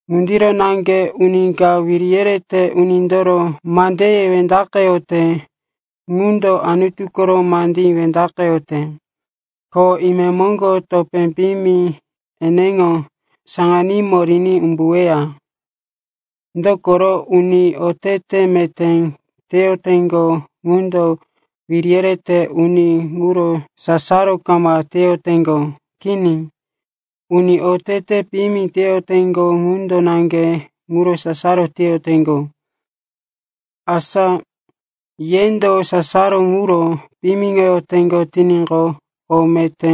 Ŋundiro naŋge uni ka wiri yerete unindoro mandeye wendaqeyote ŋundo Anutu koro mandí wendaqeyote, ko imemoŋgo topé piyimi eneŋo saŋanímo riní umbuweya. Dokoro uni otete meté teyoteŋgo ŋundo wiri yerete uni ŋuro sasaro kama teyoteŋgo. Kini, uni otete piyimi teyoteŋgo ŋundo naŋge ŋuro sasaro teyoteŋgo. Asa yendo sasaro ŋuro piyimiŋoteŋgo tiníqo, o meté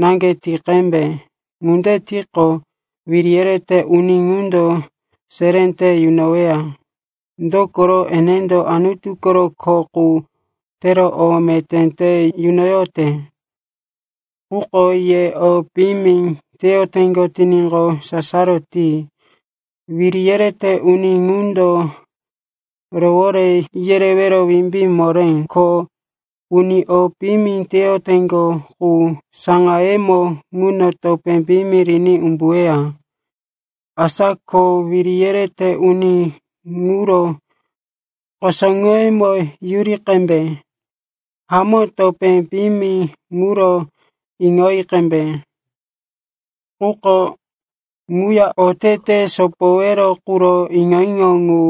naŋge ti qembe. Ŋunde tiqo, wiri yerete uni ŋundo seré te yunoweya. Dokoro enendo Anutu koro kho qu tero o meté te yunoyote. Quko ye o piyimi teyoteŋgo tiníqo, sasaro ti. Wiri yerete uni ŋundo rowore yerewero wimbí moré. Ko uni o piyimi teyoteŋgo qu, saŋayemo ŋuno topé piyimi riní umbuweya. Asa ko wiri yerete uni ŋuro kusuŋoyemo yuri qembe. Hamó, topé piyimi ŋuro iŋoyi qembe, quko ŋuya otete sopowero quro iŋo-iŋo ŋu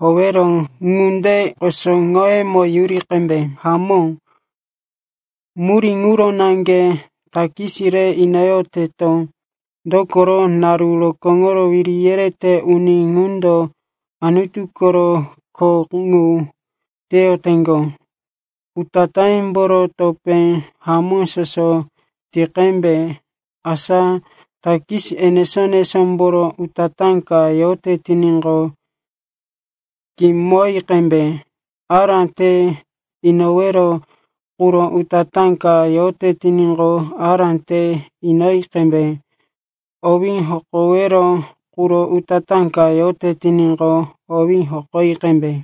howero ŋunde kusuŋoyemo yuri qembe. Hamó, murí ŋuro naŋge takis re inoyoteto. Dokoro naru rokóŋo wiri yerete uni ŋundo Anutu koro kho ŋu teyoteŋgo. Utatáyemboro topé hamó soso ti qembe. Asa takis enesó-enesómboro utatá ka yote tiníqo, kimoyi qembe, ará te inowero quro utatá ka yote tiníqo, ará te inoyi qembe, owí hokowero quro utatá ka yote tiníqo, owí hokoyi qembe.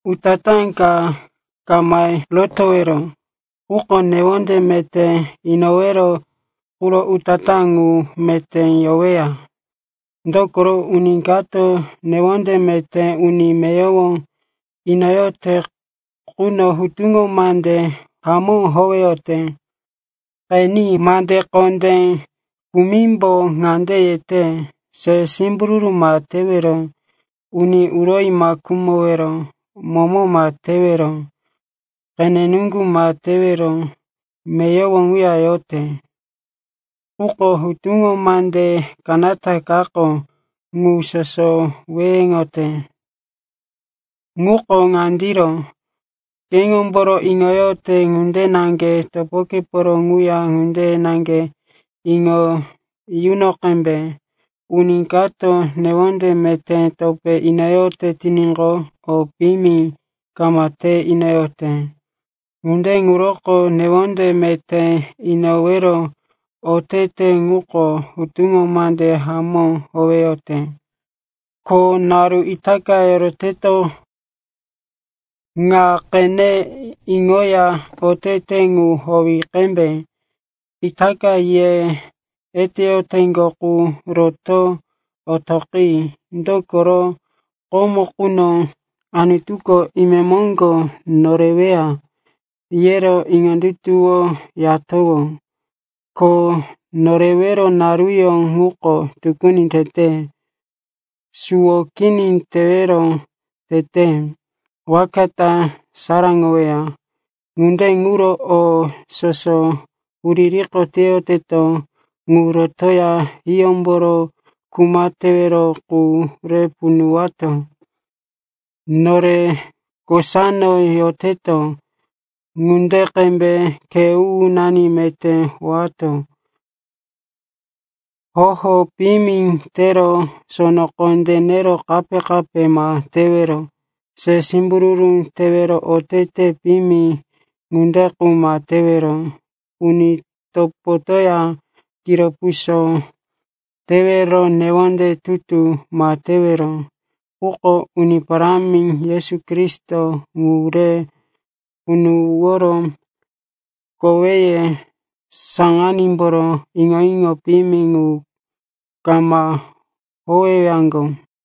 Utatá ka ma rotowero, quko newonde meté inowero quro utatá ŋu meté yoweya. Dokoro uni kato newonde meté uni meyowo inoyote quno hutuŋo mande hamó howeyote. Qeni, mande kondé kumimbo ŋande yete, “Se simbururu ma tewero,” “Uni uroyi ma khumowero,” “Momo ma tewero,” “Qene nuŋgu ma tewero.” Meyowo ŋuya yote, quko hutuŋo mande kanata kako ŋu soso weheŋoyote. Ŋuko ŋandiro, “Ke keŋomboro iŋoyote ŋunde naŋge topokeporo ŋuya ŋunde naŋge iŋo yuno qembe.” Uni kato newonde meté topé inoyote tiníqo, o piyimi kama te inoyote. Ŋunde ŋuroko newonde meté inowero otete ŋuko hutuŋo mande hamó howeyote. Ko itaka naru yoroteto ŋa qene iŋoya otete ŋu howi qembe. Itaka ye eteyoteŋgo qu roto otoqi. Dokoro komo quno, Anutuko imemoŋgo noreweya, yero iŋondutuwoyatowó. Ko norewero naruyó ŋuko tukuni tete. Suwo kini tewero tete, waka ta saraŋoweya. Ŋunde ŋuro o soso huririko teyoteto ŋu rotoya hiyómboro kuma tewero qu re punuwato. Nore kosano yoteto ŋunde qembe khe u-unani meté howato. Hoho piyimi tero sono kondé nero kape-kape ma tewero, se simbururu tero otete piyimi ŋunde qu ma tewero, uni topotoya kiro puso tero newonde tutu ma tewero. Quko Uni Parámi Yesu Kristo ŋu re punuworo koweye saŋanímboro iŋo-iŋo piyimi ŋu kama howewaŋgo.